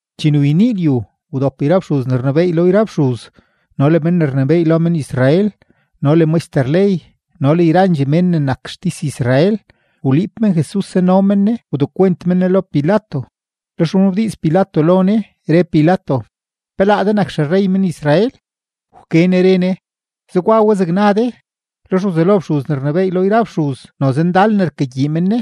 Chene wyenii lyu, wdop yra fxuz ne rnebééy lo yra fxuz, no le men ne rnebééy lo men-Israel, no le maxter ley, no le yrandxee men ne nak xtis-Israel. Wliib men Jesus, zano men Ne wdekwent men Ne lo Pilato. Lex wnabdiiz Pilato lo Ne, re Pilato: ―¿Pe laa de nak xerrey men-Israel? Wke Ne re Ne: ―Zegwa we zeg na de. Lex wzelo fxuz ne rnebééy lo yra fxuz noze ndal ne rkagyii men Ne.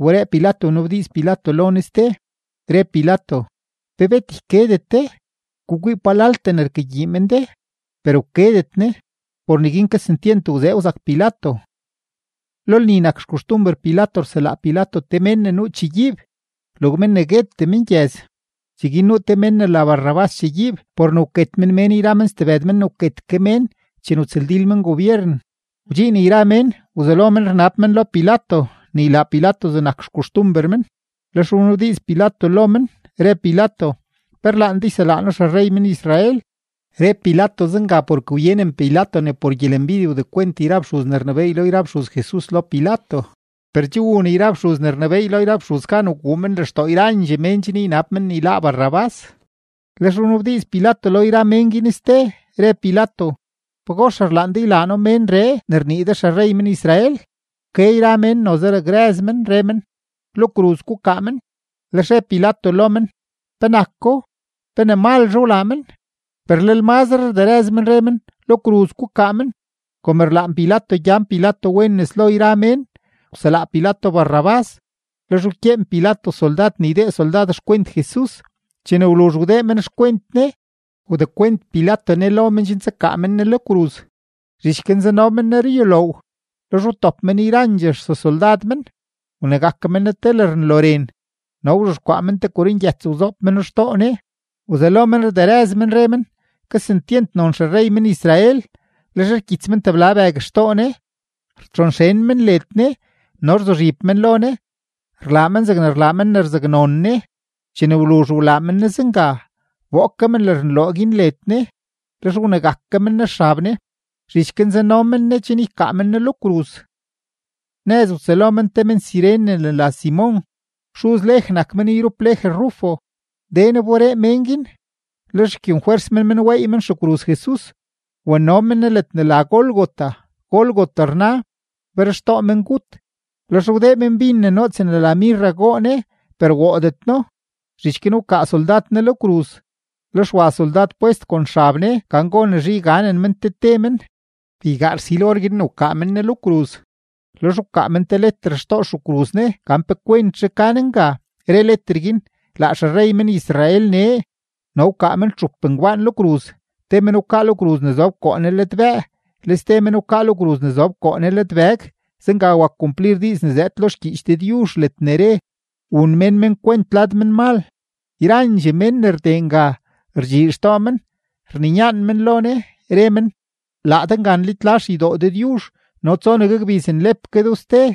Wberee Pilato wnabdiiz Pilato lo Ne ste, re Pilato: ―¿Pe bet ykedet de? Gukwii palaltee ne rkagyii men de. Per wkedetre Ne. Por neguin kesentyent wzee wzak Pilato. Lo lni nak xkoxtumber Pilato rselaa Pilato te mén ne nuu chegyiib, log mén ne guetee mengyëz. Cheguin nuu te men ne la Barrabás chegyiib por ne wket men mén yra men stebëd men ne wket ke mén chene wtsëldil men gobyeren. Wdxiin yra mén, wzelo men rnab men lo Pilato ne ylaa Pilato zegnak xkoxtumber men. Lex wnabdiiz Pilato lo men, re Pilato: ―¿Pe rlaan de yselaa noo xerrey men-Israel? Re Pilato zenga porke wyenen Pilato ne por gyelembidye wdekwent yra fxuz ne rnebééy lo yra fxuz Jesus lo Pilato. Per che wun yra fxuz ne rnebééy lo yra fxuz gan wguu men lextoo yrandxee mén chen ynab men ne yláá Barrabás. Lex wnabdiiz Pilato lo yra mén guin ste, re Pilato: ―¿Pagox rlaan de ylaa noo menree ne rnii de xerrey men-Israel? Wke yra mén, noze rderëz men, re men: ―¡Lo kruz gukaa men! Lex re Pilato lo men: ―¿Penako? ¿Pe ne malzhe wlaa men? Per lel mazre rderëz men, re men: ―¡Lo kruz gukaa men! Kom rlaan Pilato gyan Pilato wen nes lo yra mén, wselaa Pilato Barrabás; lex wkyeen Pilato soldad ne ydee soldad xkwent Jesus; chene wluzh wdee men xkwent Ne, wdekwent Pilato Ne lo men chen tsakaa men Ne lo kruz. Zhich guin zano men Ne ruyuloow; lex wtop men yrandxee sesoldad men. Wnegak men Ne te lërnloren, no wzhexkwaa men te korongyëts wzoob meno xtoo Ne. Wzelo men rderëz men, re men: ―¡Kesentyent non xerrey men-Israel! Lex rkyits men tebla bëg xtoo Ne, rtxonxen men led Ne, no rzuzhib men lo Ne, rlaa men zeg rlaa men ne rzaknon Ne. Chene wluzh wlaa men Ne zenga, wboo ke men lërnloren guin led Ne, lex wnegak ke men Ne xab Ne. Zhich guin zano men Ne chen ykaa men Ne lo kruz. Nëz wtsëlo men te men-Cirene ne la Simon, xuz Lej nak men yrup Lej Rufo; den wberee mén guin, lex wkyenfwers men men weey men xekruz Jesus. Wano men Ne ledne la Gólgota. (Gólgota rna, Berxtoo Mengut.) Lex wdee men bin ne noots ne la mirra goo Ne, per woodet No. Zhich guin wkaa soldad Ne lo kruz. Lex wa soldad pwest kon xab Ne gan gonezhe yganen men te te men. Beygaa rsil or guin ne wkaa men Ne lo kruz. Lex wkaa men leter xtoo xekruz Ne gan pe kwentzhe ka Ne nga, re leter guin: “Laa xerrey men-Israel nee.” No wkaa men txup ngbaan lo kruz, te men wkaa lo kruz ne zob koo Ne ladbëë, le ste men wkaa lo kruz ne zob koo Ne ladbëg. Zenga wak kumplir diiz ne zëëd lo xgyiich Dëdyuzh ledne re: “Wun mén men kwent lad menmal.” Yrandxee mén ne rdee nga, rdxii xtoo men, rninyaan men lo Ne, re men: ―Laa de nga nlitla xeydoo Dëdyuzh no tsonegue gbiz nlep ke do ste,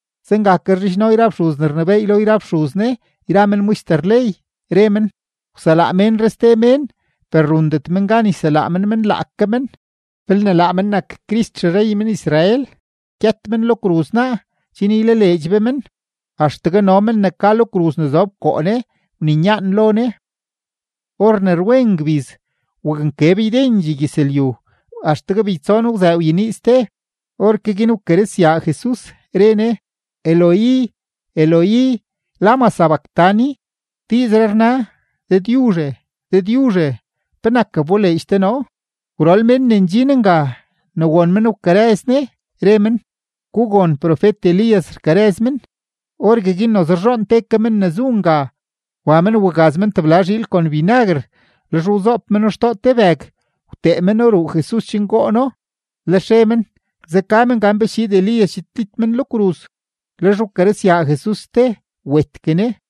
Zenga ke rzhidxno yra fxuz ne rnebééy lo yra fxuz Ne yra men maxter ley, re men: ―Wselaa ménree ste mén, per rundet men gan yselaa men men laake men. Belne laa men nak Crist xerrey men-Israel, gyët men lo kruz naa chen ylaleedx be men. Axtegue no men ne ka lo kruz ne zob koo Ne wninyaan lo Ne. Or ne rwen ngbiz, waknkeb ydendxee gyëzlyu, axtegue beytson wzëë wyenii ste. Orke guin wkarëzyaa Jesus, re Ne: ―Eloi, Eloi, ¿lama sabactani? ―Diizree rna: Dëdyuzhe, Dëdyuzhe, ¿penak wboleedx de noo? Gwrol men ne ndxin nga, ne won men wkarëz Ne, re men: ―Gugon, profet-Elías rkarëz men. Orgueguin noze rzhoon te ke men ne zu nga, wa men wagaz men tebla zhiil kon binaguer; lex wzoob meno xtoo te bëg, wtee meno ruu Jesus chen goo Ne binaguer, lex re men: ―Zeka men, gan pe schiid Elías chiidlit men lo kruz. Lex wkarëzyaa Jesus ste, wetgue Ne.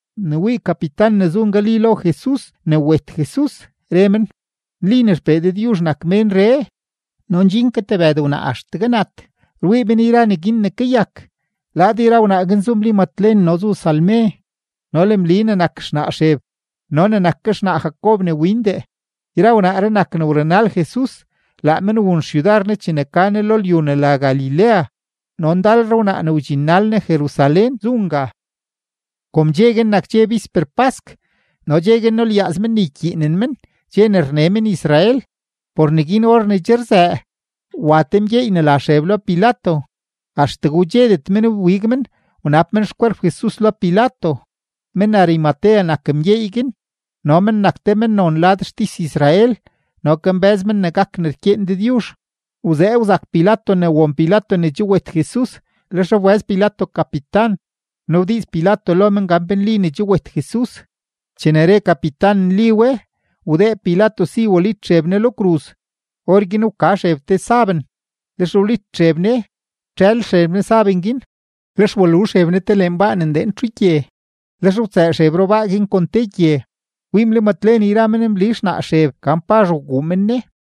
Ne wii kapitan ne zu ngali lo Jesus ne wet Jesus, re men: ―Nli ne XPee Dëdyuzh nak ménree. No ndxin ke tebëd wnaa axtegue nat, rwii men yra neguin ne kayak. Lad yra wnaa guin zu Mli Matlen no zu Salme no le Mli ne nak xnaa Xeb no ne nak ke xnaa Jacob ne windee. Yra wnaaree nak ne wrunal Jesus, laa men wun xyudar Ne chene ka Ne lo lyu ne la Galilea; no ndalre wnaa ne wdxinnal Ne Jerusalén zu nga. Kom dxe guin nak dxe bisper pask no dxe guin nulyaaz men ne ykyiinen men dxe ne rne men-Israel, por neguin or ne che rzëë, wa te mgyeey ne la Xeb lo Pilato. Axtegue wdxedet men wbig men wnab men xkwerp Jesus lo Pilato. Men-Arimatea nak mgyeey guin no men nak te mennon lad xtis-Israel no kambë́z men ne gak ne rkyeen Dëdyuzh. Wzee wzak Pilato ne won Pilato ne che wet Jesus. Lex wbëz Pilato kapitan, wnabdiiz Pilato lo men gan pe nli ne che wet Jesus. Chene re kapitan nli we, wdee Pilato si walit Xeb Ne lo kruz. Orguin wka Xeb te saben, lex wlit Xeb Ne, wtxël Xeb Ne saben guin, lex walu Xeb Ne te lenbaa ne ndeen txugye. Lex wtsëë Xeb rubaa guin kon te gye. Wii Mli Matlen yra men Mli xnaa Xeb gan pazh wguu men Ne.